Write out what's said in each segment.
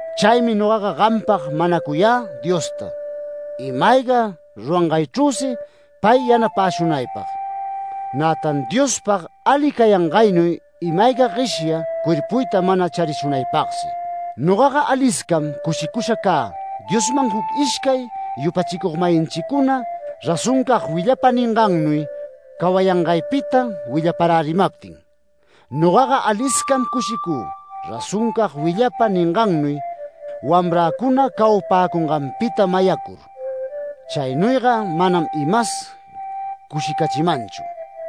Chaymi nogaga gampag manacuyä Diosta, ima-ayga rurangaychrüsi pay yanapäshunaypag, nätan Diospag ali cayangaynuy ima-ayga gueshya cuerpuyta mana charishunaypagsi. Nogaga aliscam cushicusha cä Diosman juc ishcay yupachicug-mayinchicuna razoncag willapa ningannuy cawayangaypita willaparärimaptin. Nogaga aliscam cushicü razoncag willapa ningannuy wamräcuna cawapäcunganpita mayacur. Chaynuyga manam imas cushicachimanchu.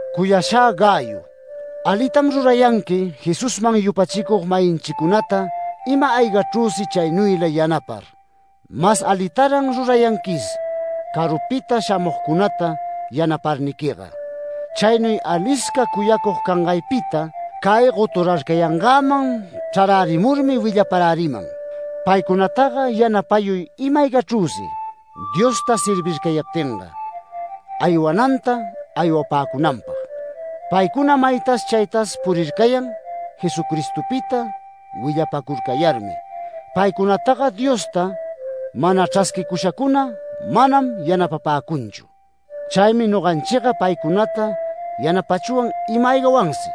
Cuyashä Gayo, alitam rurayanqui Jesusman yupachicug-mayinchicunata ima-aygachrüsi chaynuyla yanapar. Mas alitaran rurayanquis carupita shamugcunata yanaparniquiga. Chaynuy alisca cuyacug cangaypita, cay goturarcayangäman chrarärimurmi willaparäriman. Paycunataga yanapayuy ima-aygachrüsi Diosta servircayaptinga, aywananta aywapäcunanpag. Paycuna maytas chaytas purircayan Jesucristopita willapacurcayarmi. Paycunataga Diosta mana chrasquicushacuna manam yanapapäcunchu. Chaymi noganchiga paycunata yanapachwan ima-aygawansi.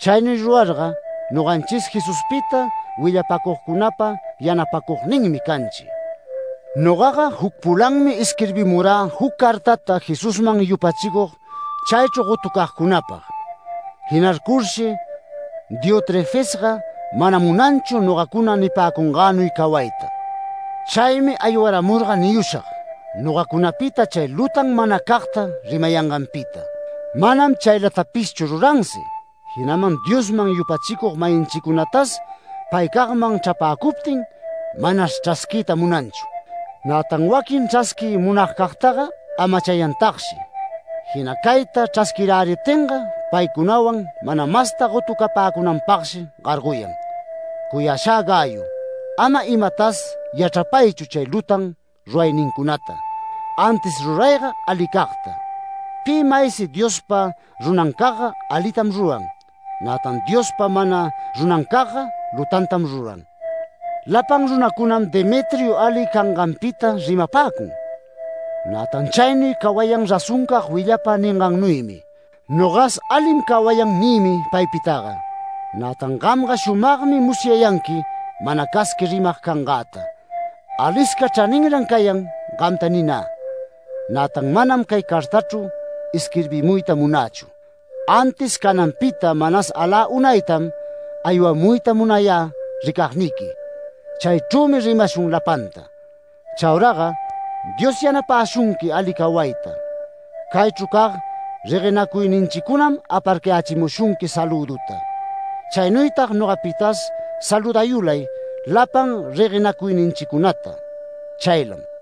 Chaynuy rurarga noganchis Jesuspita willapacugcunapa yanapacugninmi canchi. Nogaga jucpulanmi isquirbimurä juc cartata Jesusman yupachicug chaychru gotucagcunapag. Jinarcurshi Diotrefesga mana munanchu nogacuna nipäcungänuy cawayta. Chaymi aywaramurga niyushag nogacunapita chay lutan manacagta rimayanganpita. Manam chaylatapischu ruransi, jinaman Diosman yupachicug-mayinchicunatas paycagman chrapäcuptin manash chrasquiyta munanchu. Nätan waquin chrasquï munagcagtaga amachayantagshi, jinacayta chrasquiräriptinga paycunawan mana masta gotucapäcunanpagshi gargoyan. Cuyashä Gayo, ama imatas yachrapaychu chay lutan ruraynincunata, antis rurayga alicagta. Pi maysi Diospa runancagga alitam ruran. Nätan Diospa mana runancagga lutantam ruran. Lapan runacunam Demetrio ali canganpita rimapäcun, nätan chaynuy cawayan razoncag willapa ningannuymi. Nogas alim cawayan nïmi paypitaga, nätan gamga shumagmi musyayanqui mana casqui rimag cangäta. Alisca chraninran cayan gamta ninä, nätan manam cay cartachru isquirbimuyta munächu. Antis cananpita manas alä unaytam aywamuyta munayä ricagniqui, chaychrümi rimashun lapanta. Chauraga Dios yanapäshunqui ali cawayta. Caychru cag reguenacuyninchicunam aparcayächimushunqui salüduta. Chaynuytag nogapitas saludayulay lapan reguenacuyninchicunata. Chaylam.